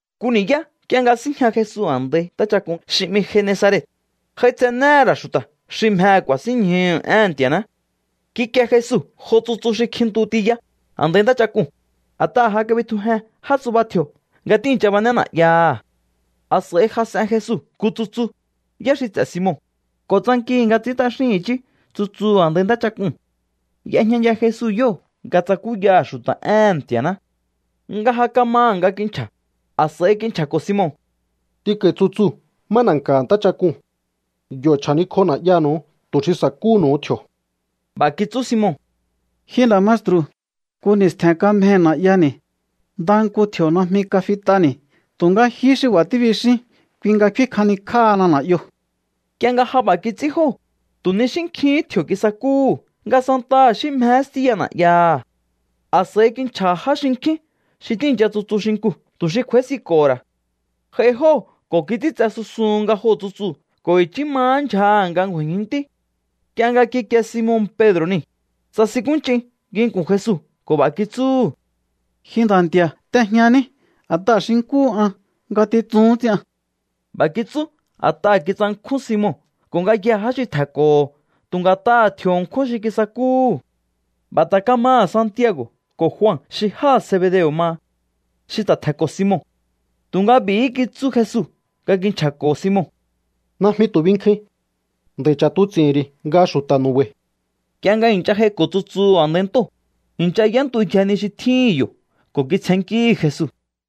Nku ni̱yá nk'ie nga síjña Jesu a̱ndai ntáchak'un xi 'mi Genesaret, j'aitsenéhe̱ ra̱ xu̱ta̱ xi mjehe̱ ku̱a̱sínñjuhu̱ éhe̱n Nti̱a̱ná. Kikie Jesu jo tsutsu xi kjintu tiya a̱ndai ntáchak'uu̱n, a̱t'aha̱ ja kabitjujen já tsuba tji̱o̱ nga tíi̱ncha bané na̱'yaha̱. A̱s'a̱i jas'en Jesu nku tsutsu, yá xi ts'e̱ Simon, ko̱ tsankihi̱ nga ts'i̱ín t'axín i̱chí tsutsuu̱ a̱ndai ntáchak'uu̱n. Y'ejñaya Jesu yóo̱ nga tsakúyaha̱ xu̱ta̱ éhe̱n Nti̱a̱ná. Nga ja kamaha̱ nga kinchja̱, a̱s'a̱i kinchja̱ko̱ Simon: —T'inko̱i̱ tsutsuu̱ má na̱nka̱ha̱ ntáchak'uu̱n. Yo̱ chja̱nikj'o na̱'yanu̱u tu̱ xi sa̱kúhu̱nu̱u tji̱o̱. B'a̱ kitsú Simon: —Ji nda̱ maestru̱, nku ni̱stje̱n kamjei̱ na̱'yani̱. Ndaha nku tji̱o̱ najmi kafit'ani̱. Tu̱nga jihí xi b'a̱ tíbixín, kui nga kfín kjanikj'áhana na̱'yoo̱. Nk'ie nga ja b'a̱ kits'ín jóo̱, tu̱ ni xí nkjihín tji̱o̱ kisakúhu̱ nga santaha xí mjehé stíya na̱'yaha̱. A̱s'a̱i kinchja̱ha̱ já xinkjín xi tíi̱ncha tsutsu xinkuu̱ tu̱ xi kj'u̱a̱ísinko̱ho̱ ra̱. J'ai jóo̱ ko̱ kits'íntse susun nga joo̱ tsutsuu̱ ko̱ i̱chí mahá ndyjaha̱ nga ngju̱a̱i̱jinntí. Nk'ie nga kikie Simon Pedro̱ niu̱, tsasinkúnch'in nginku̱n Jesu ko̱ b'a̱ kitsúhu̱: —Ji Nda̱ Nti̱a̱, t'ejñaní, a̱t'aha̱ xi nkúhu an, ngatitsuhún ts'ian. B'a̱ kitsú a̱t'aha̱ kitsankjún Simon ko̱ ngayjee̱ já xi tje̱nko̱ho̱ tu̱ nga̱t'aha̱ tji̱o̱ ṉkjún xi kisakúhu̱. B'a̱ ta̱ kamaha̱ Santiago̱ ko̱ Jua xi jáha̱ Zebedeo̱ maha, xi ta̱ tje̱nko̱ Simon. Tu̱nga b'i̱hí kitsú Jesu nga kinchja̱ko̱ Simon: —Najmi tu̱ binkjuin. Nd'a̱i̱ ch'a̱tuts'i̱hi̱n ri̱ nga xu̱ta̱ nu̱ba̱i̱. Nk'ie nga i̱ncha j'aiko̱ tsutsuu̱ a̱ndai ntóo̱, i̱ncha y'éntuyje ni xi tjíhi̱n yo̱ ko̱ kitsjennkíhi̱ Jesu.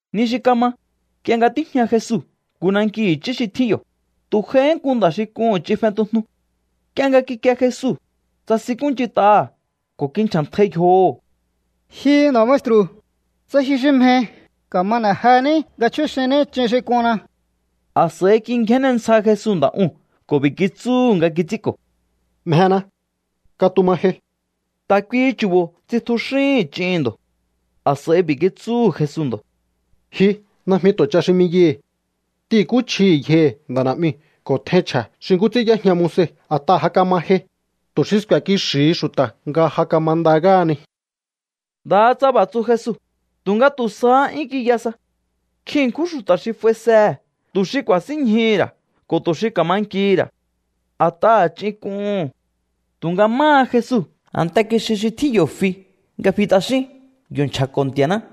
Ni xi kama, nk'ie nga tíjña Jesu nku nanki i̱chí xi tjín yo̱, tu̱ j'aihí nku nda̱ xi k'uhu̱n ch'in fentujnu. Nk'ie nga kikie Jesu, tsasinkúnch'int'aha̱ ko̱ kinchja̱ntjai yjoho̱: —Ji nda̱ maestru̱, tsa ji xi mjehi, ka̱ma n'e̱ jení nga chjúxinní ch'in xi k'unna. A̱s'a̱i kingjénne ntsja Jesu nda̱ uu̱n ko̱ b'i̱ kitsúhu̱ nga kits'ínko̱: —Mjena. Katuma jei. Ta̱ kuihi chu̱bo̱ tsitjuxíhi̱n ch'ihi̱n ndo̱. A̱s'a̱i b'i̱ kitsúhu̱ Jesu ndo̱: —Ji, najmi tu̱ ch'a xi 'miyaihi̱. T'ihi̱nkúchjihi̱ yjohi̱ nda̱ na̱'miu̱ ko̱ tjein chje̱ xi nkú ts'ín y'éjña Moise a̱t'aha̱ ja kama jei, tu̱ xi sku̱e̱ kixi̱hi xu̱ta̱ nga ja kamanda ngáhani. Ndaha tsa b'a̱ tsu Jesu, tu̱nga tu̱ sahá 'yún kiya sa. Nkjin ṉkjún xu̱ta̱ xi f'aisehe̱ tu̱ xi ku̱a̱sínñjuhu̱ ra̱ ko̱ tu̱ xi ka̱ma nkihi̱ ra̱, a̱t'aha̱ ch'in k'uhu̱n. Tu̱nga máha Jesu, a̱nte kixi xi tjín yo̱ fi nga fi t'axín. Yo̱ kinchja̱ko̱ Nti̱a̱ná.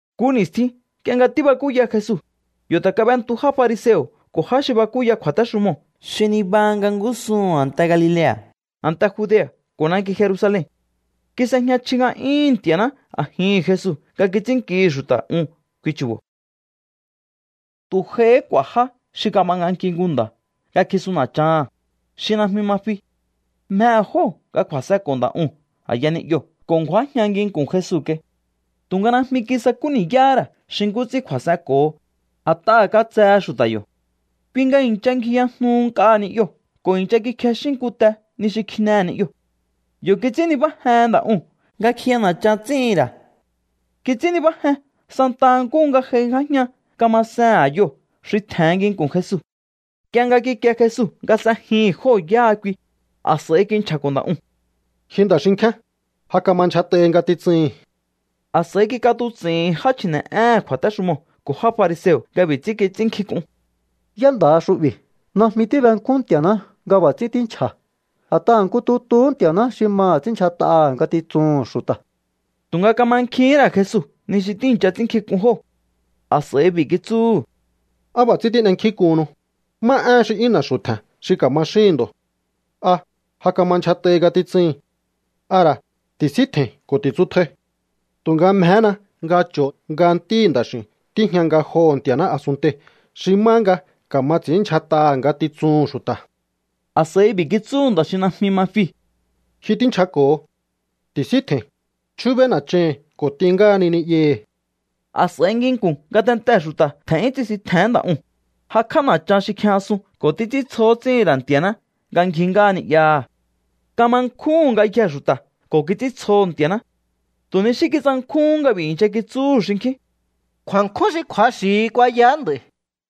Nku ni̱stjin nk'ie nga tíbakúya Jesu, yo̱ ta̱ kab'entu já fariseo̱ ko̱ já xi bakúya kju̱a̱téxumoo̱ xi nibaha nga ngúsuhu̱n a̱nte Galilea̱, a̱nte Judea̱ ko̱ nanki Jerusalen. Kis'ejña chji nga'yúhu̱n Nti̱a̱ná a̱jihi̱n Jesu nga kits'ínnkihi̱ xu̱ta̱ un kui chu̱bo̱. Tu̱ j'aihí k'u̱a̱ já xi kab'anganki nku nda̱ nga kjisun na̱chaha̱n, xi najmi ma fi. Mjehe̱ jóo̱ nga kju̱a̱s'enko̱ nda̱ uu̱n a̱ya ni'yoo̱ ko̱ ngju̱ájña nginku̱n Jesu kai. Tu̱nga najmi kisakú ni̱yáhá ra̱ xi nkú ts'ín kju̱a̱s'enko̱ho, a̱t'aha̱ katsehe xu̱ta̱ yo̱. Kui nga i̱ncha ngjiyajnuhu nk'a ni'yoo̱ ko̱ i̱ncha kikjexín nku te ni xi kjinehe̱ ni'yoo̱. Yo̱ kits'ín nibájen nda̱ uu̱n nga kjiya na̱chan ts'íhi̱n ra̱. Kits'ín nibájen santa nkúhu nga j'aingjájña kamasehe̱n a̱yoo̱ xi tje̱hen nginku̱n Jesu. Nk'ie nga kikie Jesu nga s'ejihi̱n jóo̱ yáha kui, a̱s'a̱i kinchja̱ko̱ nda̱ uu̱n: —Ji nda̱ xinkjíán, ja kama ndyjat'ahi ngatitsuhi̱n. A̱s'a̱i kik'atuts'i̱hi̱n já chji̱ne̱'éhe̱n kju̱a̱téxumoo̱ ko̱ já fariseo̱ nga b'i̱ ts'ín kits'ínnkjink'un: “¿Yá nda̱ha xu'bi̱? Najmi tíbenkjún Nti̱a̱ná nga b'a̱ ts'ín tínchja̱. A̱t'aha̱ nku tutuhú Nti̱a̱ná xi maha̱ ts'ínndyjat'aha̱ ngatitsuhu̱n xu̱ta̱.” Tu̱nga kamankjihín ra̱ Jesu ni xi tíi̱ncha ts'ínnkjink'un jóo̱. A̱s'a̱i b'i̱ kitsúhu̱: —¿Á b'a̱ ts'ín tín'enkjínk'uhunnu? ¿Má éhen xi 'yún na̱xu̱ tje̱n xi ka̱ma xíhi̱n ndo̱? ¿A: “Ja kama ndyjat'ahi ngatitsuhi̱n”? ¿A ra̱: “Ti̱síntje̱i̱n ko̱ ti̱tsutjai”? Tu̱nga mjehéna nga cho̱o nga Ntíhi̱ Nda̱x'i̱u̱n tíjña ngajoho̱ Nti̱a̱ná a̱sunntei̱ xi má nga ka̱ma ts'i̱ínndyjat'aha̱ ngatitsuhu̱n xu̱ta̱. A̱s'a̱i b'i̱ kitsúhu̱ nda̱ xi najmi ma fiu̱: —Ji tínchjako̱ho. Ti̱síntje̱i̱n, chjúbéí na̱chahi̱n ko̱ t'in ngáhani ni'yahi̱. A̱s'a̱i nginku̱n ngatentee̱ xu̱ta̱ tje̱n'yún tsisintje̱hén nda̱ uu̱n, jakj'á na̱chan xi kjijñasun ko̱ títs'íntsjo ts'íhi̱n ra̱ Nti̱a̱ná nga ngji ngáha ni'yaha̱. Kama nkjúhu̱n ngayjee̱ xu̱ta̱ ko̱ kits'íntsjoho̱ Nti̱a̱ná. Tu̱ ni xí kitsankjúhún nga b'i̱ i̱ncha kitsúhu̱ xinkjín: —Kju̱a̱nkjún xi kju̱axi̱hi kuayaá nd'a̱i̱.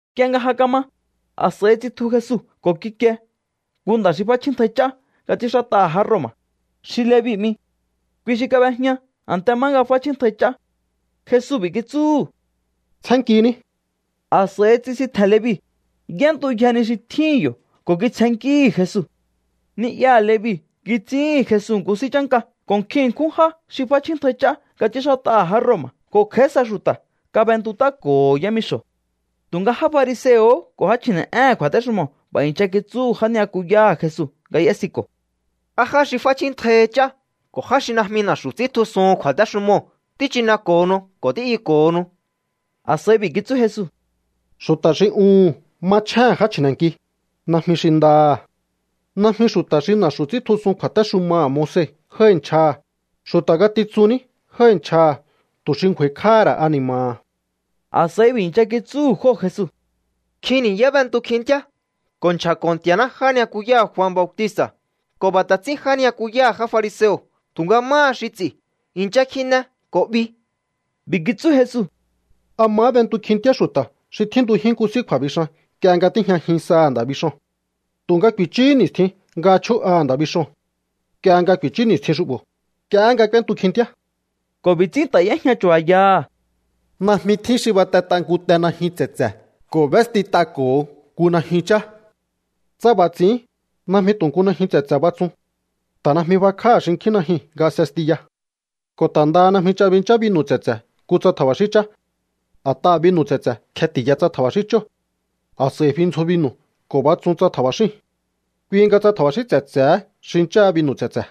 Nk'ie nga ja kama, a̱s'a̱i tsitju Jesu ko̱ kikie nku nda̱ xi f'áchjíntjai ch'á nga ts'ínxát'aha̱ já Roma̱, xi Levi 'mi. Kui xi kab'ejña a̱nte má nga f'áchjíntjai ch'á. Jesu b'i̱ kitsúhu̱: —Tsjénnkiní. A̱s'a̱i tsisintje̱n Levi, y'éntuyje ni xi tjíhi̱n yo̱ ko̱ kitsjennkíhi̱ Jesu. Ni'yaha̱ Levi kits'íhi̱n Jesu nku s'í chánka ko̱ nkjin ṉkjún já xi f'áchjíntjai ch'á nga ts'ínxát'aha̱ já Roma̱ ko̱ kj'a̱í sa xu̱ta̱ kab'entut'áko̱ho̱ yámixo̱. Tu̱nga já fariseo̱ ko̱ já chji̱ne̱'éhe̱n kju̱a̱téxumoo̱ b'a̱ i̱ncha kitsúhu̱ já ni'yakuyáha̱ Jesu nga y'ésiko̱: —¿Á já xi f'áchjíntjaihi ch'á ko̱ já xi najmi na̱xu̱ ts'íntjusuhun kju̱a̱téxumoo̱ tíchineko̱honu ko̱ tí'yuko̱honu? A̱s'a̱i b'i̱ kitsú Jesu: —Xu̱ta̱ xi uhu̱n machjéhe̱n já chji̱ne̱nki, najmi xi ndaha̱. Najmi xu̱ta̱ xi na̱xu̱ ts'íntjusun kju̱a̱téxumaha̱ Moise jái̱ nchjaha̱, xu̱ta̱ ngatitsun ní jái̱ nchjaha̱ tu̱ xi ngju̱a̱i̱kj'áha̱ ra̱ ani̱ma̱ha̱. A̱s'a̱i b'i̱ i̱ncha kitsúhu̱ jóo̱ Jesu: —Nkjin ni̱yá b'entu kjintíá ko̱ nchja̱ko̱ Nti̱a̱ná já ni'yakuyáha̱ Jua Bautista̱, ko̱ b'a̱ ta̱ ts'ín já ni'yakuyáha̱ já fariseo̱. Tu̱nga máha xi ts'i̱, i̱ncha kjine ko̱ 'bi. B'i̱ kitsú Jesu: —¿A mahá b'entu kjintíá xu̱ta̱ xi tjíntujín nku s'í kju̱a̱bixan nk'ie nga tíjñajin saha̱ nda̱ bixoo̱n? Tu̱nga ku̱i̱chúhú ni̱stjin nga chjú'aha̱ nda̱ bixoo̱n. Nk'ie nga ku̱i̱chú ni̱stjin xu'bo̱, nk'iehé nga k'úéntu kjintíá. Ko̱ b'i̱ ts'ín ta̱ y'éjña chu̱ba̱yaha̱: —Najmi tjín xi batet'a nku te najyun tse̱tse̱ ko̱ b'éstit'ako̱ho nku najyun chá. Tsa b'a̱ ts'i̱ín, najmi tu̱ nku najyun tse̱tse̱ batsun. Ta̱ najmi b'akjáha̱ xinkjín najyuu̱n nga s'estiya. Ko̱ ta̱ ndaha najmi ch'a binchá binu̱ tse̱tse̱ nku tsa tja̱ba̱xín chá. A̱t'aha̱ binu̱ tse̱tse̱ kjeti̱ya tsa tja̱ba̱xín chóo̱. A̱s'a̱i fi ndzjo binu̱ ko̱ batsún tsa tja̱ba̱xíu̱n. Kui nga tsa tja̱ba̱xín tse̱tse̱hé xincháha binu̱ tse̱tse̱.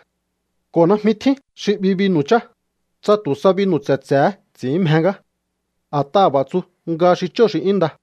’Ko̱ najmi tjín xi 'bi binu̱ chá, tsa tu̱ sa binu̱ tse̱tse̱hé ts'i̱ín mje ngá. A̱t'aha̱ b'a̱ tsu nga xi chóo̱ xi 'yún nda.